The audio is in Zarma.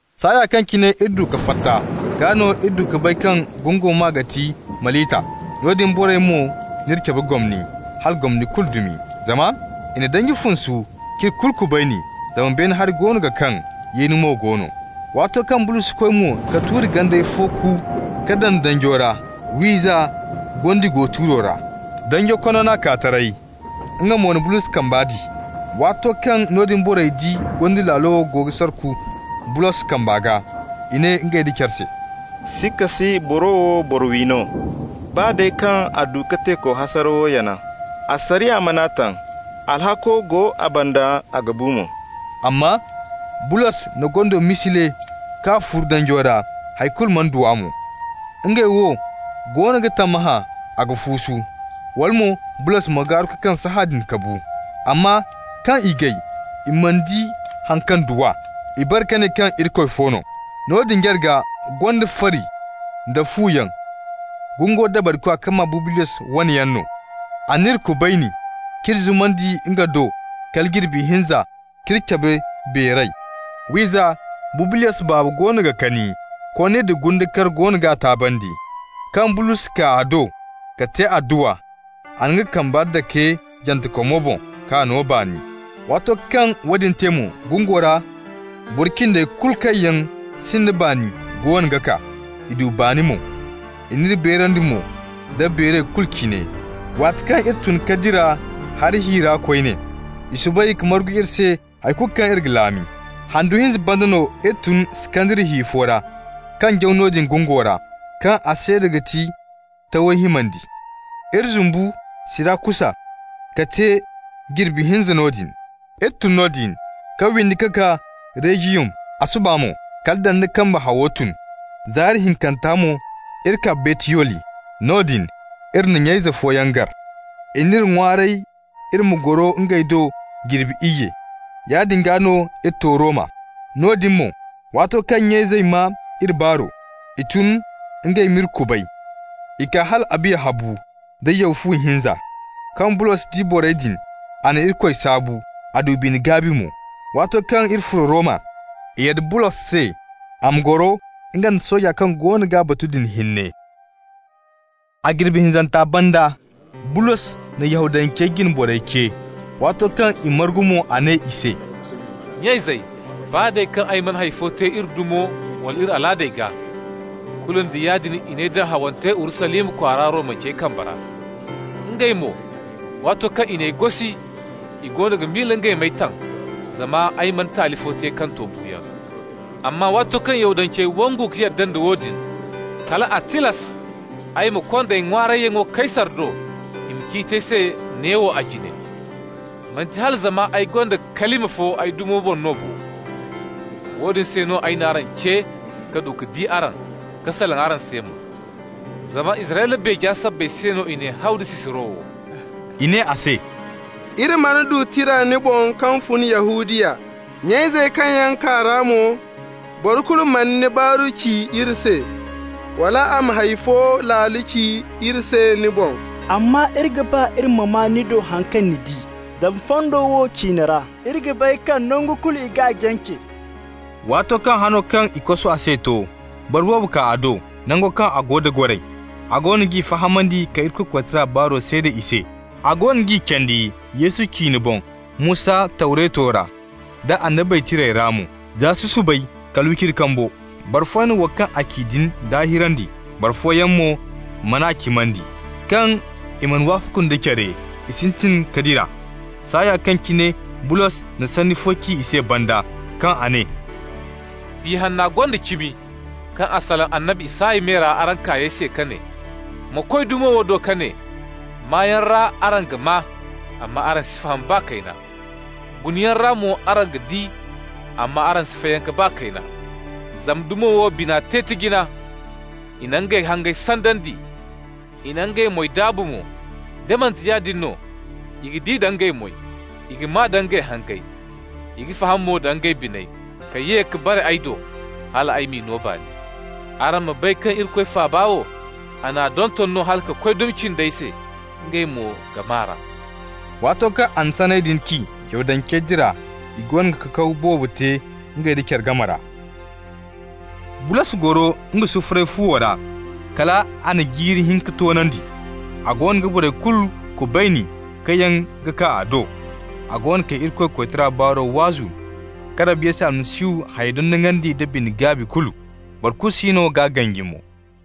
Saaya kaŋ cine iri du ka fatta, gaa no iri du ka bay kaŋ gungo maa ga ti Malita. Noodin borey mo n'iri cabe gomni, hala gomni kulu dumi. Zama i na danji funsu k'iri kulu kubayni, zama beene hari goono ga kaŋ, yeeni mo go no. Waato kaŋ Bulos koy mo ka tuuri ganday fo ku ka daŋ danjo ra, wiiza, gondi go tuuro ra. Danjo konno n'a kaa taray, nga mo na Bulos kambe di. Waato kaŋ noodin borey di gondi laalo wo go ga sarku Bulos kamba gaa, i ne ngey nda care se: «Sikka si boro wo boro-wi no. Baa day kaŋ a du ka teeko hasarawo yana, asariya man'a taŋ. Alhakko go a banda, a ga bu mo.» Amma Bulos na gondo misile k'a furu danjo ra, hay kulu mana du a mo. Ngey wo goono ga tammahã a ga fuusu, wala mo Bulos ma gaaru ka kaŋ sahãadin ka bu. Amma kaŋ i gay i mana di haŋ kaŋ du a, i bare ka ne kaŋ irikoy fo no. Noodin jarga gonda fari nda fu yaŋ, gungo dabarikwa kaŋ maa Bubliyos wane yaŋ no. A n'iri kubayni, k'iri zumandi nga do kala jirbi hinza k'iri cabe beeray. Wiiza, Bubliyos baaba goono ga kani, konni da gunde kar goono g'a taabandi. Kaŋ Bulos kaa a do ka te adduwa, a na nga kambe dake jantekomo boŋ k'a no baani. Waato kaŋ woodin te mo, gungo ra boro cindey kulu kaŋ yaŋ sinda baani goono ga kaa, i du baani mo. I n'iri beerandi mo da beeray kulu cine. Waati kaŋ iri tun ka dira hari hi ra koyne, i soobay ka margu iri se hay kulu kaŋ iri ga laami. Handu hinza banda no iri tun Iskandariya hi fo ra, kaŋ jaw noodin gungo ra, kaŋ a seeda ga ti Tawey himandi. Iri zumbu Sirakusa ka te jirbi hinza noodin. Iri tun noodin ka windi ka kaa Regiyum. A suba mo kala dandi kambe hawo tun. Zaari hinkanta mo iri kaa Buteyoli. Noodin iri na nya-ize fooyaŋ gar, i n'iri ŋwaaray iri ma goro ngey do jirbi iyye. Yaadin gaa no iri to Roma. Noodin mo, waato kaŋ nya-izey maa iri baaro, i tun ngey m'iri kubay. I kaa hal Abiya Habu da Yaw-Fu-Hinza. Kaŋ Bulos di borey din, a na Irikoy saabu, a du bine-gaabi mo. Waato kaŋ iri furo Roma, i yadda Bulos se a ma goro nga nda sooja kaŋ goono g'a batu din hinne. A jirbi hinzanta banda, Bulos na Yahudancey jine borey ce. Waato kaŋ i margu mo, a ne i se: «Nya-izey, baa day kaŋ ay mana hay fo te iri dumo wala iri alaadey gaa, kulu nda yaadin i n'ay daŋ hawante Urusalima kwaara Romancey kambe ra. Ngey mo, waato kaŋ i n'ay gosi, i goono ga miila ngey m'ay taŋ zama ay mana taali fo te kaŋ to buuyaŋ. Amma waato kaŋ Yahudancey wangu ka yadda nda woodin, kal a tilas ay gaa ya konda ay ŋwaarayyaŋo Kaysar do, i ma ciiti ay se neewo a jine. Manti hala zama ay gonda kalima fo ay dumo boŋ no bo. Woodin se no ay n'araŋ ce ka du ka di araŋ, ka salaŋ araŋ se mo. Zama Israyla beeja sabbay se no i n'ay haw da sisiro wo.» I ne a se: «Iri mana du tira ni boŋ kaŋ fun Yahudiya. Nya-izey kaŋ yaŋ kaa ra mo, boro kulu mana ni baaru ci iri se, wala a ma hay fo laalo ci iri se ni boŋ. Amma iri ga ba iri ma maa ni do haŋ kaŋ ni di. Zama fondo wo ciine ra, iri ga bay kaŋ nangu kulu i g'a jance.» Waato kaŋ hano kaŋ i kosu a se to, boro boobo kaa a do, nango kaŋ a go da goray. A goono g'i fahamandi ka Irikoy koytara baaro seeda i se, a goono g'i candi Yesu ciine boŋ Musa Tawreto ra, da Annabey Tirey ra mo, za susubay kala wiciri kambo. Boro fooyaŋ na wo kaŋ a ci din daahirandi, boro fooyaŋ mo man'a cimandi. Kaŋ i mana wafaku nda care, i sintin ka dira, saaya kaŋ cine Bulos na sanni fo ci i se banda, kaŋ a ne: «Biya Hanna gonda cimi kaŋ a salaŋ annabi Isaya me ra araŋ kaayey se ka ne: ‹Ma koy dumo wo do ka ne: Maayaŋ ra, araŋ ga maa, amma araŋ si faham baa kayna. Gunayaŋ ra mo, araŋ ga di amma araŋ si fayanka baa kayna. Zama dumo wo bina te tijina, i na ngey hangey sandandi, I na ngey moy daabu mo. Da manti yaadin no i ga di da ngey moy, i ga maa nda ngey hangey, i ga faham mo da ngey biney ka ye ka bare ay do, hal ay m'i no baani.› Araŋ ma bay kaŋ Irikoy faaba wo, a n'a donton hala ka koy dumi cindey se, ngey mo ga maa r'a.» Waato kaŋ a na sanney din ci, Yahudancey dira, i goono ga kakaw boobo te ngey nda care game ra. Bulos goro nga sufuray fuwo ra kal a na jiiri hinka toonandi. A goono ga borey kulu kubayni kaŋ yaŋ ga kaa a do. A goono ga Irikoy koytara baaro waazu ka Rabbi Yesu Almasihu hayey dondonandi nda bine-gaabi kulu, boro kulu siino g'a ganji mo.